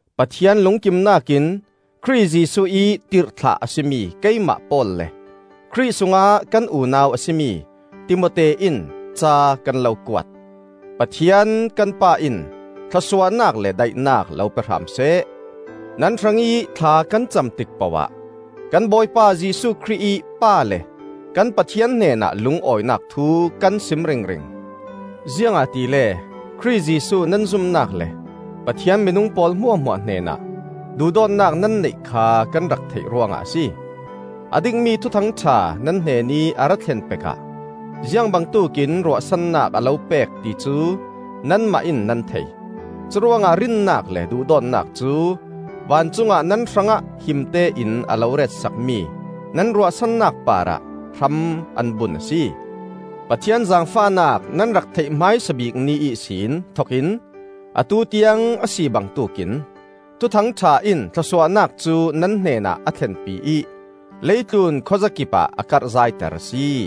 Pathian lungkimnak in Khrih Jesuh ih tirhthlah a si mi keimah Paul le Khrih sungah kan unau a si mi Timote in ca kan lo kuat. Pathian kan Pa in thlawsuahnak le daihnak lo pe hram seh. Nan hrangih thla kan cam tik poh ah kan Bawipa Jesuh Khrih ih Pa le kan Pathian hnenah lungawinak thu kan sim ringring. Ziangahtile Khrih Jesuh nan zumnak le Pathian minung pawl hmuahhmuah hnenah duhdawtnak nan neih kha kan rak theih ruangah a si. A dikmi Thuthang ṭha nan hnenih a ra thlen pek ah ziang bangtuk in ruahsannak a lo pek ti cu nanmah in nan thei. Curuangah rinnak le duhdawtnak cu vancungah nan hrangah himte in a lo retsakmi nan ruahsannak parah hram an bun a si. Pathian zaangfahnak nan rak theih hmaisa bik ni ihsin thokin atu tiang a si bangtuk in, Thuthang ṭha in thlawsuahnak cu nan hnenah a thlenpi ih leitlun khuazakipah a karh zaiter a si.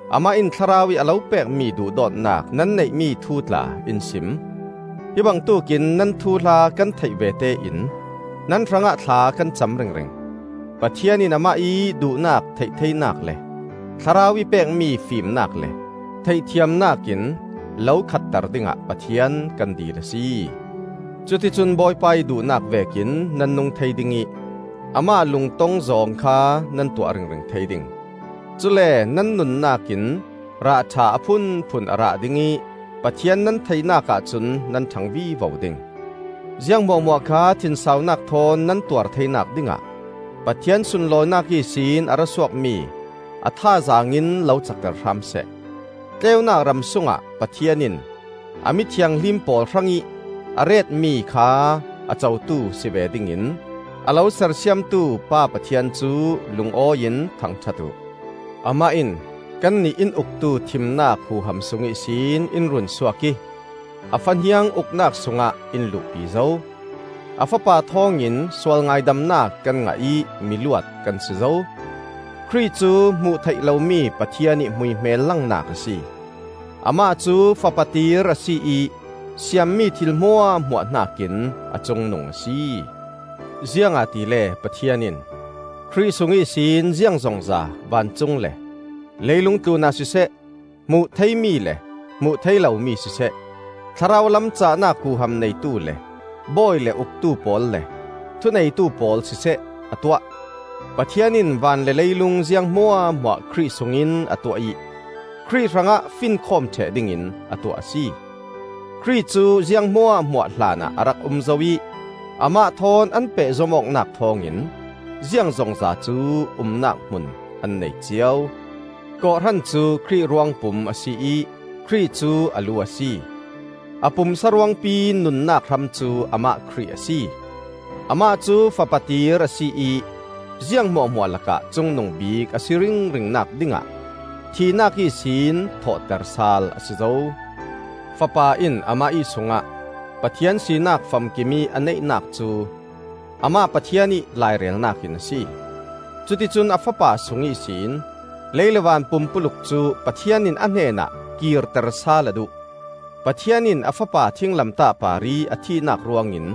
Amah in Thlarau ih a lo pekmi duhdawtnak nan neihmi thu tla in sim. Hi bangtuk in nan thuhla kan theih vete in nan hrangah thla kan cam ringring. Pathian in amah ih duhnak theih theinak le Thlarau ih pekmi fimnak le theihthiamnak in lo khatter dingah Pathian kan dil a si. Cuticun Bawipa ih duhnak vekin nan nung thei ding ih amah lungtong zawng kha nan tuah ringring thei ding. Cule nan nunnak in rah ṭha a phunphun a rah ding ih Pathian nan theihnak ahcun nan ṭhang vivo ding. Ziang hmuahhmuah kha thinsaunak thawn nan tuartheinak dingah Pathian sunlawinak ihsin a ra suakmi a thazaang in lo cakter hram seh. Tleunak ram sungah Pathian in a mi thianghlim pawl hrangih a retmi kha a cotu si ve dingin a lo sersiamtu Pa Pathian cu lungawi in thangṭhat uh. Amah in kannih in uktu thimnak huham sung ihsin in runsuak ih a Fahniang uknak sungah in luhpi zo; a Fapa thawngin sual ngaidamnak kan ngah ih miluat kan si zo. Khrih cu hmuh theih lomi Pathian ih hmuihmel langnak a si. Amah cu Fapa tir a si ih siammi thil hmuahhmuah hnakin a cungnung a si. Ziangahtile Pathian in Khrih sung ihsin ziangzongza vancung le leilung tlunah siseh, hmuh theimi le hmuh thei lomi siseh, thlarau lam cahnak huham neitu le bawi le uktu pawl le thuneitu pawl siseh a tuah. Pathian in van le leilung ziang hmuahhmuah Khrih sungin a tuah ih Khrih hrangah finkhawm ṭheh dingin a tuah a si. Khrih cu ziang hmuahhmuah hlanah a rak um zo ih amah thawn an pehzom awknak thawngin ziangzongza cu umnak hmun an nei cio. Kawhhran cu Khrih ruangpum a si ih Khrih cu a lu a si. A pumsa ruangpi nunnak hram cu amah Khrih a si. Amah cu Fapa tir a si ih ziang hmuahhmuah lakah cungnung bik a si ringringnak dingah thihnak ihsin thawhter sal a si zo. Fapa in amah ih sungah Pathian sinak famkimih a neihnak cu amah Pathian ih lairelnak in a si. Cuticun a Fapa sung ihsin lei le van pumpuluk cu Pathian in a hnenah kirter sal a duh. Pathian in a Fapa thinglamtah parih a thihnak ruangin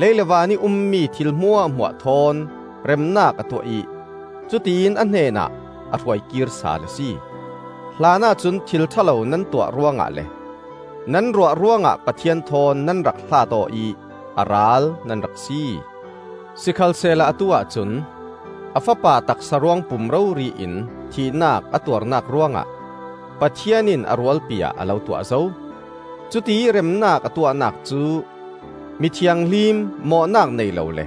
lei le vanih ummi thil hmuahhmuah thawn remnak a tuah ih cutiin a hnenah a hruaikir sal a si. Hlanah cun thil ṭha lo nan tuah ruangah le nan ruah ruangah Pathian thawn nan rak hlaat aw ih a ral nan rak si. Sikhalsehla atu-ah cun a Fapa taksa ruangpum rori in thihnak a tuarnak ruangah Pathian in a rualpi-ah a lo tuah zo. Cutiih remnak a tuahnak cu mi thianghlim, mawhnak nei lo le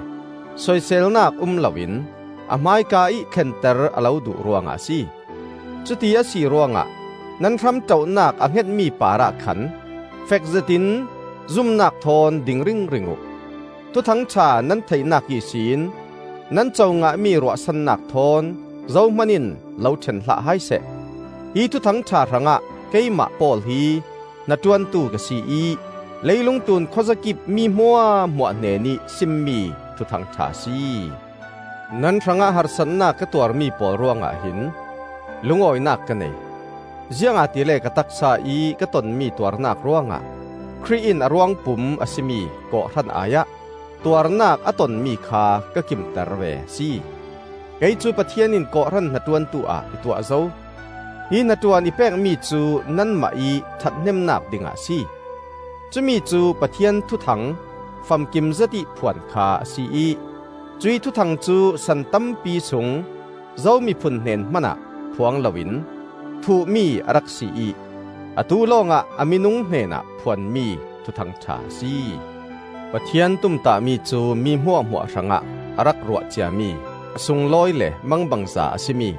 soiselnak um loin a hmaika ih thlenter a lo duh ruangah a si. Cuti a si ruangah nan hramṭoh-nak a hngetmi parah khan fekzetin zumnak thawn ding ringring uh. Thuthang ṭha nan theihnak ihsin nan co ngahmi ruahsannak thawn zohman in lo ṭhen hlah hai seh. Hi Thuthang ṭha hrangah keimah Paul hi hnaṭuantu ka si ih, leilung tlun khuazakip mi hmuahhmuah hnenih simmi Thuthang ṭha a si. Nan hrangah harsatnak ka tuarmi pawl ruangah hin lungawinak ka nei; ziangahtile ka taksa-ih ka tonmi tuarnak ruangah Khrih in a ruangpum a si mi kawhhran ai ah tuarnak a tonmi kha ka kimter ve a si. Kei cu Pathian in kawhhran hnaṭuantu ah i tuah zo. Hi hnaṭuan i pekmi cu nanmah ih ṭhathnemnak dingah a si. Cumi cu Pathian thuthang famkim zetih phuan kha a si ih, cuih thuthang cu san tampi sung zo miphun hnen hmanah phuang loin thuhmi a rak si ih atu lawngah a minung hnenah phuanmi Thuthang ṭha a si. Pathian tumtahmi cu mi hmuahhmuah hrangah a rak ruah ciami a sunglawi le mangbangza a si mi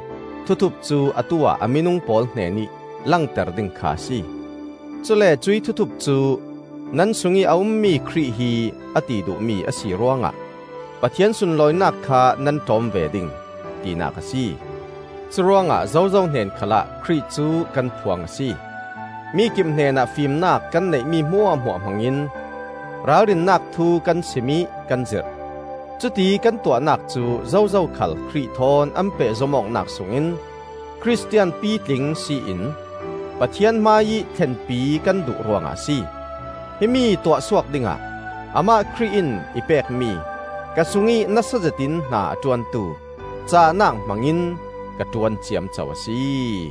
thuthup cu atu-ah a minung pawl hnenih langter ding kha a si. Cule cuih thuthup cu nan sungih a ummi Khrih hi a ti duhmi a si ruangah Pathian sunlawinak kha nan ṭawm ve ding, tinak a si. Curuangah zozo hnen khalah Khrih cu kan phuang a si. Mikip hnenah fimnak kan neihmi hmuahhmuah hmangin ralrinnak thu kan sim ih kan zirh. Cuti kan tuahnak cu zozo khal Khrih thawn an pehzom awknak sungin Khristian pitling si in Pathian hmaiih thlenpi kan duh ruangah a si. Himi tuahsuak dingah amah Khrih in i pekmi, ka sungih nasa zetin hna a ṭuantu, cahnak hmangin ka ṭuan ciamco a si.